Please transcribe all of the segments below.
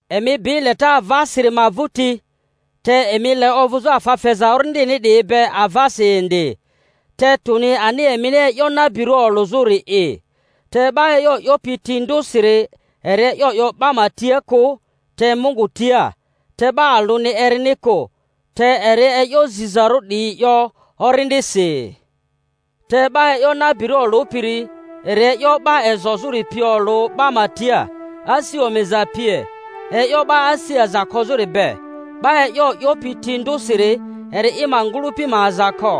Emi bi leta avasiri ma vᴜti, te emi ma le ovᴜzᴜ afa feza Orindini 'diyi be avasi indi, te tᴜni ani emini e'yo nabirᴜ olᴜzᴜri'i. Te 'ba e'yo 'yopi ti ndᴜsiri eri e'yo 'yo 'ba ma tia kᴜ, te Mungu tia; te 'ba alᴜni erini kᴜ, te eri e'yo zizarᴜ 'diyi 'yo Orindisi. Te 'ba e'yo nabirᴜ olᴜpiri eri e'yo 'ba ezozᴜri pi olᴜ 'ba ma tia, asi omiza pie, e'yo 'ba asi aza kozᴜri be. 'Ba e'yo 'yopi ti ndᴜsiri eri i ma ngᴜlᴜpi ma aza ko,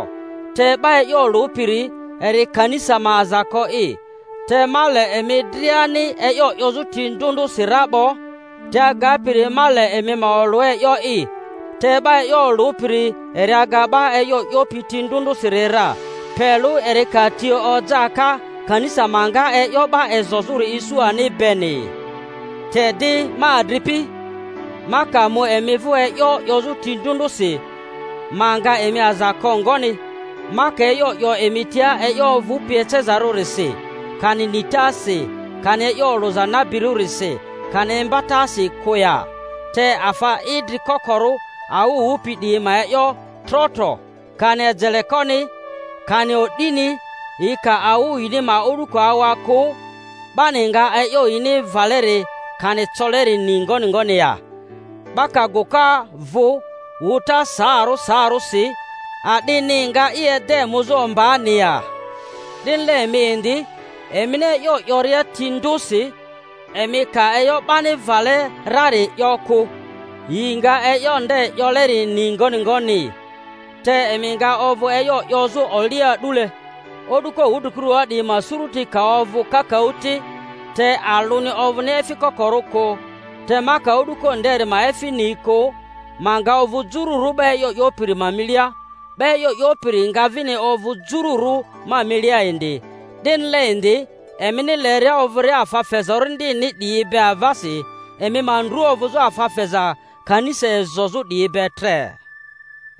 te 'ba e'yo olᴜpiri eri kanisa ma aza ko'i. Te ma le emi driani e'yo 'yozᴜ ti ndᴜ ndᴜsi ra 'bo, te agapiri ma le emi ma olᴜ e'yo'i Te 'ba e'yo olᴜpiri eri aga 'ba e'yo 'yopi ti ndᴜ ndᴜsiri ra, pe lᴜ eri ka ti oja ka, kanisa ma nga e'yo 'ba ezozᴜri isu ani beni. Te di, ma adripi, ma ka mu emi vᴜ e'yo 'yozᴜ ti ndᴜ ndᴜsi, ma nga emi aza ko ngoni, ma ka e'yo 'yo emi tia e'yo ovᴜpi ecezarᴜrisi, kani nitasi, kani e'yo olᴜza nabirᴜrisi, kani imbatasi kᴜ ya? Te afa idri kokorᴜ awᴜ wᴜpi 'diyi ma e'yo tro-tro, kani ejelekoni, kani o'dini, yi ka awᴜ yini ma o'duko awa kᴜ, 'bani nga e'yo yini vᴜleri kani coleri ni ngoni ngoni ya? 'Ba ka gᴜka vᴜ wᴜta saarᴜ saarᴜsi, a'dini nga i ede muzᴜ ombaani ya? 'Dinile emi indi, emini e'yo 'yoria ti ndᴜsi, emi ka e'yo 'bani vale rari 'yo kᴜ, yi nga e'yo nde 'yoleri ni ngoni ngoni? Te emi nga ovᴜ e'yo 'yozᴜ olia a'dule. O'duko wudrikurua 'diyi ma suruti ka ovᴜ kakaᴜ ti, te alᴜni ovᴜni efi kokorᴜ kᴜ; te ma ka o'duko nderi ma efi ni kᴜ, ma nga ovᴜ jururᴜ 'ba e'yo 'yopiri ma milia, 'ba e'yo 'yopiri nga vini ovᴜ jururᴜ ma milia indi. 'Dinile indi, emini leria ovᴜria afa feza Orindini 'diyi be avasi, emi ma ndru ovᴜzᴜ afa feza kanisa ezozᴜ 'diyi be tre.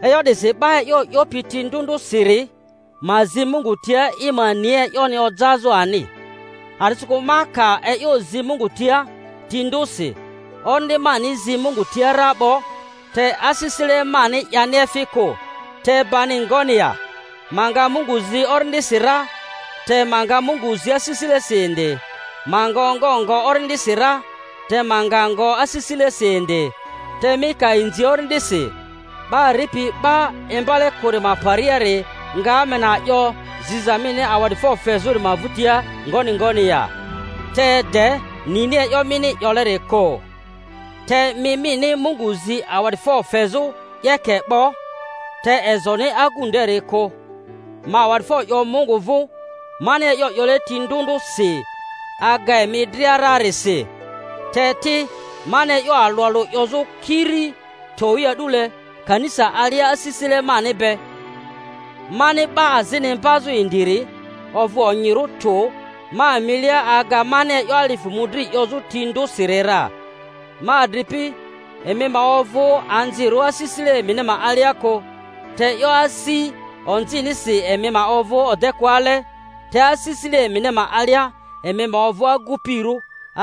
E'yo 'disi 'ba e'yo 'yopi ti ndᴜ ndᴜsiri ma zi Mungu tia i ma ni e'yoni ojazᴜ ani. A'disikᴜ ma ka e'yo zi Mungu tia ti ndᴜsi, orindi mani zi Mungu tia ra 'bo, te asisile mani'yani efi kᴜ. Te bani ngoni ya? Ma nga Mungu zi orindisi ra, te ma nga Mungu zi asisilesi indi; ma nga ongo ngo orindisi ra, te ma nga ngo asisilesi indi. Te mi ka inzi orindisi, 'ba ripi 'ba imbale kᴜri ma pariari nga Amena 'yo ziza mini awa'difo fezᴜri ma vᴜtia ngoni ngoni ya? te de nini e'yo mini 'yoleri kᴜ. Te mi mini Mungu zi awa'difo fezᴜ 'yeke 'bo, te ezoni agu nderi kᴜ. Ma awa'difo 'yo Mungu vᴜ, mani e'yo 'yole ti ndᴜ ndᴜsi aga emi dria rarisi; te ti, mani e'yo alᴜ alᴜ 'yozᴜ kiri towi a'dule kanisa alia asisile mani be, mani 'ba azini imbazᴜ indiri, ovᴜ onyirᴜ tᴜ ma milia aga mani e'yo alifᴜ mᴜdri 'yozᴜ ti ndᴜsiri ra. Ma adripi, emi ma ovᴜ anzirᴜ asisile emini ma alia kᴜ; te e'yo asi onzinisi emi ma ovᴜ odekᴜale, te asisile emini ma alia emi ma ovᴜ agupirᴜ.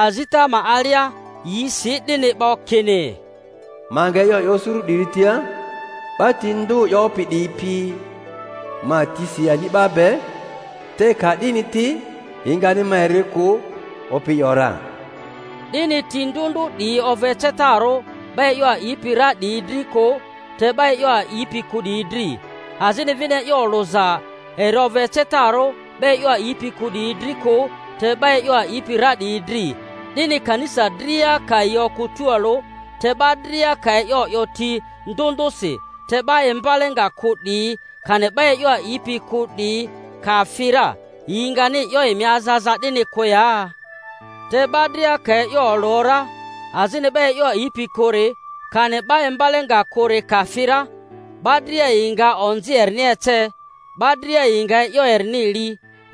Azita ma alia yi si 'dini 'bo, kini, Ma nga e'yo 'yo suru 'diri tia 'ba ti ndᴜ 'yopi 'diyi pi ma tisi ani'ba be, te ka 'dini ti yi ngani ma eri kᴜ, Opi 'yo ra. 'Dini ti ndᴜ ndᴜ 'diyi ovᴜ ecetarᴜ 'ba e'yo a'ipi ra 'diyi dri kᴜ, te 'ba e'yo a'ipi kᴜ 'diyi dri; azini vini e'yo olᴜza eri ovᴜ ecetarᴜ 'ba e'yo a'ipi kᴜ 'diyi dri kᴜ, te 'ba e'yo a'ipi ra 'diyi dri. 'Dini, kanisa dria ka yi okᴜ tualᴜ, te 'ba dria ka e'yo 'yo ti ndᴜ ndᴜsi, te 'ba imbale nga kᴜ 'diyi, kani 'ba e'yo a'ipi kᴜ 'diyi ka fi ra, yi ngani 'yo emi aza aza 'dini kᴜ ya? Te 'ba dria ka e'yo olᴜ ra, azini 'ba e'yo a'ipi kᴜri, kani 'ba imbale nga kᴜri ka fi ra, 'ba dria yi nga onzi erini ece, 'ba dria yi nga e'yo erini li,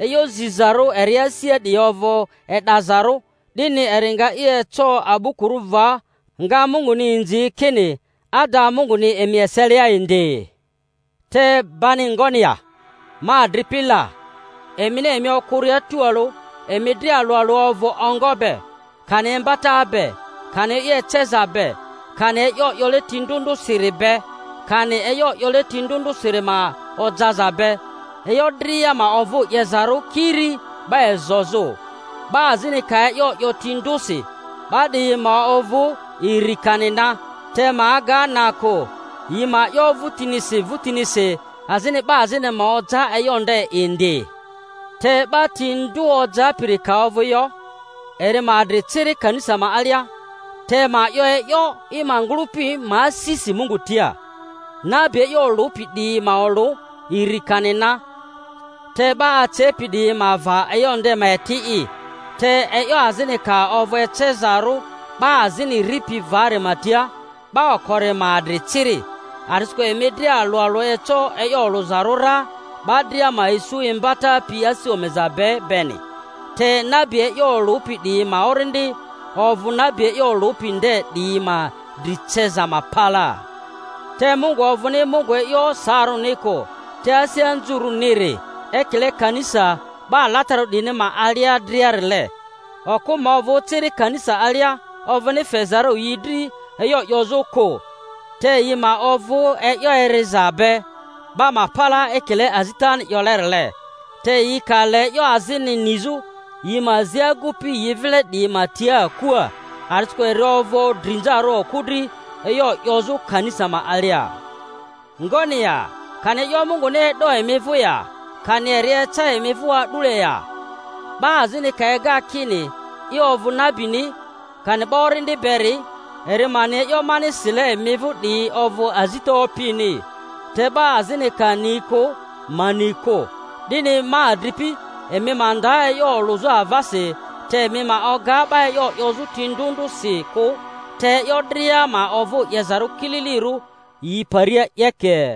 e'yo zizarᴜ eri asia 'diyi ovᴜ e'dazarᴜ; 'dini eri nga i eco a'bukurᴜ va, nga Munguni inzi, kini ada Munguni emi eselia indi. Te bani ngoni ya, ma adripi la? Emini emi okᴜria tualᴜ, emi dria alᴜ alᴜ ovᴜ ongo be, kani imbata be, kani e'yo eceza be, kani e'yo 'yole ti ndᴜ ndᴜsiri be, kani e'yo 'yole ti ndᴜ ndᴜsiri ma ojaza be. E'yo dria ma ovᴜ 'yezarᴜ kiri 'ba ezozᴜ. 'Ba azini ka e'yo 'yo ti ndᴜsi, 'ba 'diyi ma ovᴜ iri kani na, te ma aga na kᴜ, yi ma 'yo vᴜtinisi vᴜtinisi; azini 'ba azini ma oja e'yo nde indi. Te 'ba ti ndᴜ ojapiri ka ovᴜ yo, eri ma adri ciri kanisa ma alia, te ma 'yo e'yo i ma ngᴜlᴜpi ma asisi Mungu tia. Nabi e'yo olᴜpi 'diyi ma olᴜ, iri kani na, te 'ba acepi 'diyi ma va e'yo nde ma eti'i. Te e'yo azini ka ovᴜ ecezarᴜ 'ba azini ripi vari ma tia, 'ba okori ma adri ciri. A'disikᴜ emi dria alᴜ alᴜ eco e'yo olᴜzarᴜ ra, 'ba dria ma isu imbata pi asi omiza be beni; te nabi e'yo olᴜpi 'diyi ma orindi ovᴜ nabi e'yo olᴜpi nde 'diyi ma dri ceza ma palaa. Te Mungu ovᴜni Mungu e'yo saarᴜni kᴜ, te asi anzurᴜniri; ekile kanisa 'ba alatararᴜ 'diyini ma alia driarile. Okᴜ ma ovᴜ ciri kanisa alia; ovᴜni fezarᴜ yi dri e'yo 'yozᴜ kᴜ; te yi ma ovᴜ e'yo eriza be 'ba ma palaa ekile azitani 'yolerile. Te yi ka le e'yo azini nizᴜ, yi ma zi agupi yi vile 'diyi ma tia akua. A'disikᴜ eri ovᴜ drinzarᴜ okᴜ dri e'yo 'yozᴜ kanisa ma alia. Ngoni ya! Kani e'yo Munguni e'do emi vᴜ ya? Kani eri eca emi vᴜ a'dule ya? 'Ba azini ka ega kini i ovᴜ nabini, kani 'ba orindi beri'i, eri ma ni e'yo mani sile emi vᴜ 'diyi ovᴜ azita Opini. Te 'ba azini ka ni kᴜ, ma ni kᴜ. 'Dini, ma adripi, emi ma nda e'yo olᴜzᴜ avasi, te emi ma oga 'ba e'yo 'yozᴜ ti ndᴜ ndᴜsi kᴜ. Te e'yo dria ma ovᴜ 'yezarᴜ kililirᴜ yi paria 'yeke.